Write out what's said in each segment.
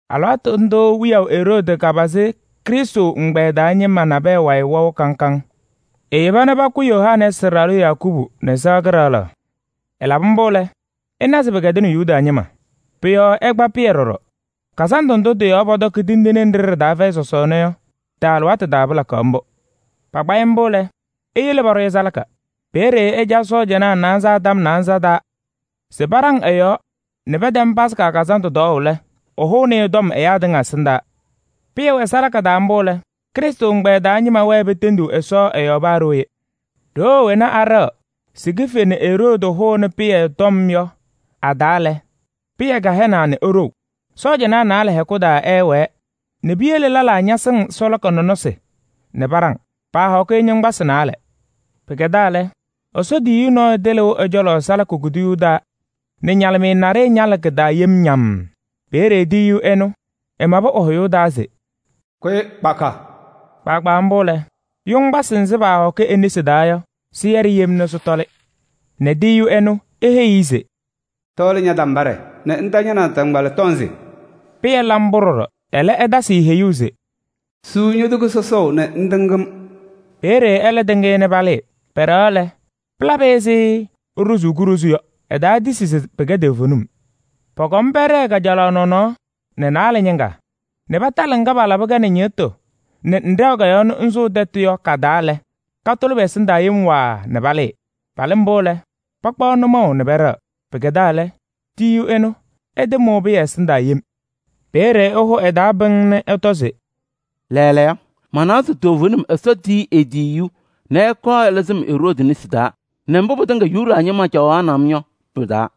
Alɩwaatʋ ndʋʋ wiyaʋ Eroodi kapazɩ Krɩstʋ ɛgbɛyɛ taa ñɩma nabɛyɛ wayɩ wɛʋ kaŋ kaŋ. Eyeba nɛ pakʋ Yohanɛɛsɩ ɖalʋ Yakubu nɛ sɩɣa kɩɖaɣlaɣ. Ɛlabɩ mbʋ lɛ, ɛna se pɩkɛdɩnɩ Yuda ñɩma. Pʋ-yɔɔ ɛkpa Pɩyɛ ɖɔɖɔ. Sɔsɔɔna Fɛyɩ Tindine Kazandʋ alɩwaatʋ taa pɩlakaɣ mbʋ. Pakpa-ɩ mbʋ lɛ, eyele paɖʋ-ɩ salaka. Peeye ɛca sɔɔjanaa naanza tɔm naanza taa se paɖaŋ ɛ-yɔɔ nɛ pɛtɛm Yomiye Taa Lɩʋ Kazandʋ tɔɔʋ lɛ, ɛhʋnɩ-ɩ ɛyaa tɩŋa ɛsɩndaa. Pɩyɛ wɛ salaka taa mbʋ lɛ, Krɩstʋ ɛgbɛyɛ taa ñɩma wɛɛ petendiɣ Ɛsɔ ɛ-yɔɔ kaahɛzaɣ. Ɖoo wena aɖɛɣaɣ se kife nɛ Eroodi hʋnɩ Pɩyɛ tɔm yɔ a-taa lɛ, Pɩyɛ kahɛnaa nɛ eɖou. Sɔɔjanaa naalɛ hɛkʋ taa ɛɛwɛɛ nɛ piyele lɛlaa ñasɩŋ salaka nɔnɔsɩ nɛ paɖaŋ. Paahɔkɩ-ɩ yoŋgbasɩ naalɛ. Pɩkɛdaa lɛ, Ɛsɔ tiyiyu nɔɔyʋ tɩlɩʋ ɛ-cɔlɔ salaka kuduyuu taa nɛ ñalɩmɩyɛ naɖɩyɛ ñalɩ kɩ-taa yem ñammm. Peeye tiyiyu ɛnʋ ɛmabɩ ɛ-hʋyʋʋ taa se: “Kʋyɩ kpaka!” Kpaagbaa mbʋ lɛ, yoŋgbasɩ nzɩ paahɔkɩ e-nesi taa yɔ, sɩyɛɖɩ yem nɛ sɩtɔlɩ nɛ tiyiyu ɛnʋ eheyi-i se: “Tɔɔlɩ ña-tambaɖɛ nɛ ŋta ña-naataŋgbala tɔnzɩ.” Pɩyɛ la mbʋ ɖɔɖɔ, ɛlɛ ɛtasɩ-ɩ heyuu se: “Suu ño-toko sɔsɔʋ nɛ ŋtɩŋ-m.” Peeye ɛlɛ tɩŋ-ɩ nɛ palɩɩ. Pɛɖɛɣaɣ lɛ, pɩlabɩ-ɩ ɛzɩ eɖozuu kuɖozu yɔ. Ɛtaatisi se pɩkɛ toovenim. Pɔkɔm pɛɖɛɛ kajalaɣ nɔnɔɔ nɛ naalɛ ñɩŋga nɛ patalɩ ŋga palabɩ-kɛ nɛ ñɩɣtʋ nɛ ŋɖɛɣ-kɛ nɛ ŋsʋʋ tɛtʋ taa yɔ ka-taa lɛ, katʋlɩ pɛ-ɛsɩndaa yem waaa nɛ palɩɩ. Palɩ mbʋ lɛ, pakpaɣ nʋmɔʋ nɛ pɛɖɛɣ. Pɩkɛdaa lɛ, tiyiyu ɛnʋ ɛtɩmʋʋ Pɩyɛ ɛsɩndaa yem. Peeye ɛhʋ ɛ-taa pɩŋŋ nɛ ɛtɔ se: “Lɛɛlɛɛyɔ, manawa se toovenim Ɛsɔ tiyini e-tiyiyu nɛ ɛkɔɔ ɛlɩzɩ-m Eroodi nesi taa nɛ mbʋ pɩtɩŋa Yuda ñɩma caɣaɣnɩ-m yɔ pɩ-taa.”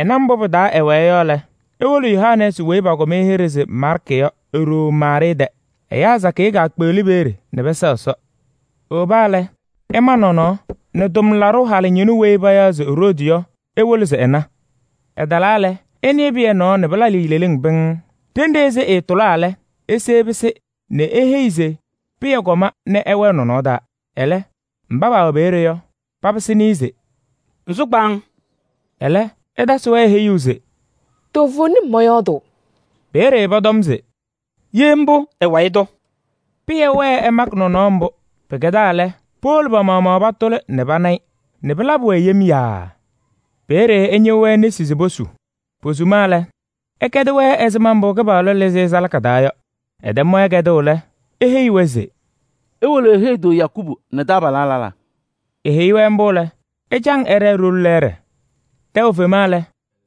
Ɛna mbʋ pɩ-taa ɛwɛɛ yɔ lɛ, ewolo Yohanɛɛsɩ weyi pakʋm-ɩ hɩɖɛ se Maarkɩ yɔ e-ɖoo Maarɩɩ tɛ. Ɛyaa sakɩyɛ kaakpeɣli peeye nɛ pɛsɛɣ Ɛsɔ. Ewoba lɛ, ɛma nɔnɔɔ nɛ tʋmlaɖʋ halʋ ñɩnʋ weyi payaɣ se Roodi yɔ, ewolo se ɛna. Ɛtalaa lɛ, ɛnɩɩ Pɩyɛ nɔɔ nɛ pɩlabɩ-ɩ leleŋ pɩŋŋ. Ɖenɖe ɛzɩ ɛɛtʋlaa lɛ, ese ɛpɩsɩ nɛ eheyi se Pɩyɛ kɔma nɛ ɛwɛɛ nɔnɔɔ taa. Ɛlɛ, mba paawɛ peeye yɔ, papɩsɩnɩ-ɩ se: “Ŋsʋ kpaaŋ!” Ɛlɛ ɛtasɩ-wɛ heyuu se: “Toovenim mɔyɔɔdʋʋ.” Peeye pɔtɔm se: “Ye mbʋ, ɛ-wayɩ tʋ.” Pɩyɛ wɛɛ ɛmakɩ nɔnɔɔ mbʋ. Pɩkɛdaa lɛ, powolo pa-maɣmaɣ patʋlɩ nɛ pana-ɩ nɛ pɩlabɩ-wɛ yem yaaa. Peeye ɛñɩɣ-wɛ nesi se posu. Posuma lɛ, ɛkɛdɩ-wɛ ɛzɩma mbʋ Kɩpaɣlʋ lɩzɩ-ɩ salaka taa yɔ. Ɛtɛm-wɛ kɛdʋʋ lɛ, eheyi-wɛ se: “Iwolo iheyi-tʋ Yakubu nɛ taabalaa lɛlaa.” Eheyi-wɛ mbʋ lɛ, ɛcaŋ ɛɖɛɛ ɖoli lɛɛɖɛ. Tɛʋ fema lɛ,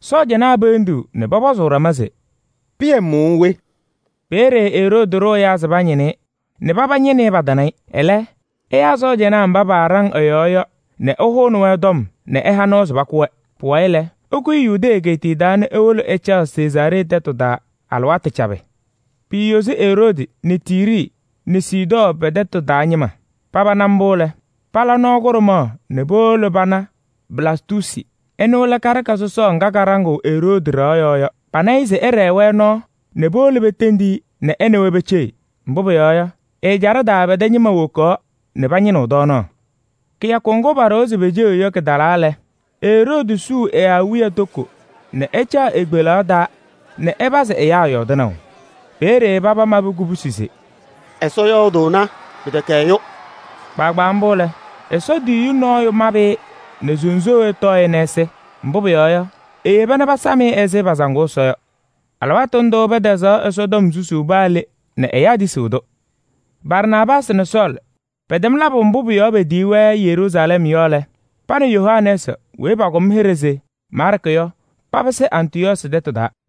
sɔɔjanaa peendiɣ nɛ pɔpɔzʋʋ ɖama se: “Pɩyɛ mʋʋ we?” Peeye Eroodi ɖʋ ɛyaa se pañɩnɩ-ɩ nɛ paba ñɩnɩ-ɩ, patana-ɩ. Ɛlɛ ɛyaa sɔɔjanaa mba paaɖaŋ ɛ-yɔɔ yɔ nɛ ɛhʋnɩ-wɛ nɛ ɛha nɔɔ se pakʋ-wɛ. Pʋwayɩ lɛ, ɛkʋyɩ Yudee egeetiye taa nɛ ewolo ɛcaɣ Sezaaree tɛtʋ taa alɩwaatʋ cabɩ. Piiyozi Eroodi nɛ Tiiri nɛ Sidɔɔ pɛ-tɛtʋ taa ñɩma. Paba na mbʋ lɛ, pala nɔɔ kʋɖʋmaɣ nɛ powolo pana Blastuusi. Ɛnʋ lɛ karɩka sɔsɔɔ ŋga kaɖaŋɩɣ Eroodi ɖɩɣa yɔɔ yɔ. Pana-ɩ se ɛɖɛɛ-wɛ nɔɔ nɛ powolo petendi-i nɛ ɛ nɛ wɛ peceɣ. Mbʋ pʋyɔɔ yɔ, ɛ-ɛjaɖɛ taa pɛ-tɛ ñɩma wokaɣ nɛ pañɩnɩɣ tɔɔnaɣ. Kɩyakʋ ŋgʋ paɖʋwa se peceɣ yɔ kɩtalaa lɛ, Eroodi suu ɛ-awiya toko nɛ ɛcaɣ e-kpelaɣ taa nɛ ɛpazɩ ɛyaa yɔɔdɩnaʋ. Peeye paba mabɩ kubusi se: “Ɛsɔ yɔɔdʋʋna! Pɩtɛkɛ ɛyʋ!” Kpaagbaa mbʋ lɛ, Ɛsɔ tiyiyu nɔɔyʋ mabɩ-ɩ nɛ sunzuuwee tɔɔ-ɩ nɛ ɛsɩ. Mbʋ pʋyɔɔ yɔ, eyeba nɛ pasam-ɩ ɛzɩ pasaŋʋʋ Ɛsɔ yɔ. Alɩwaatʋ ndʋʋ pɛtɛzaɣ Ɛsɔtɔm susuu paa le nɛ ɛyaa tisiɣ-tʋ. Barnaabaasɩ nɛ Sɔɔlɩ pɛtɛm labʋ mbʋ pʋ-yɔɔ petiyi-wɛ Yeruusalɛm yɔ lɛ, pa nɛ Yohanɛɛsɩ weyi pakʋm hɩɖɛ se Maarkɩ yɔ papɩsɩ Antɩyɔɔsɩ tɛtʋ taa.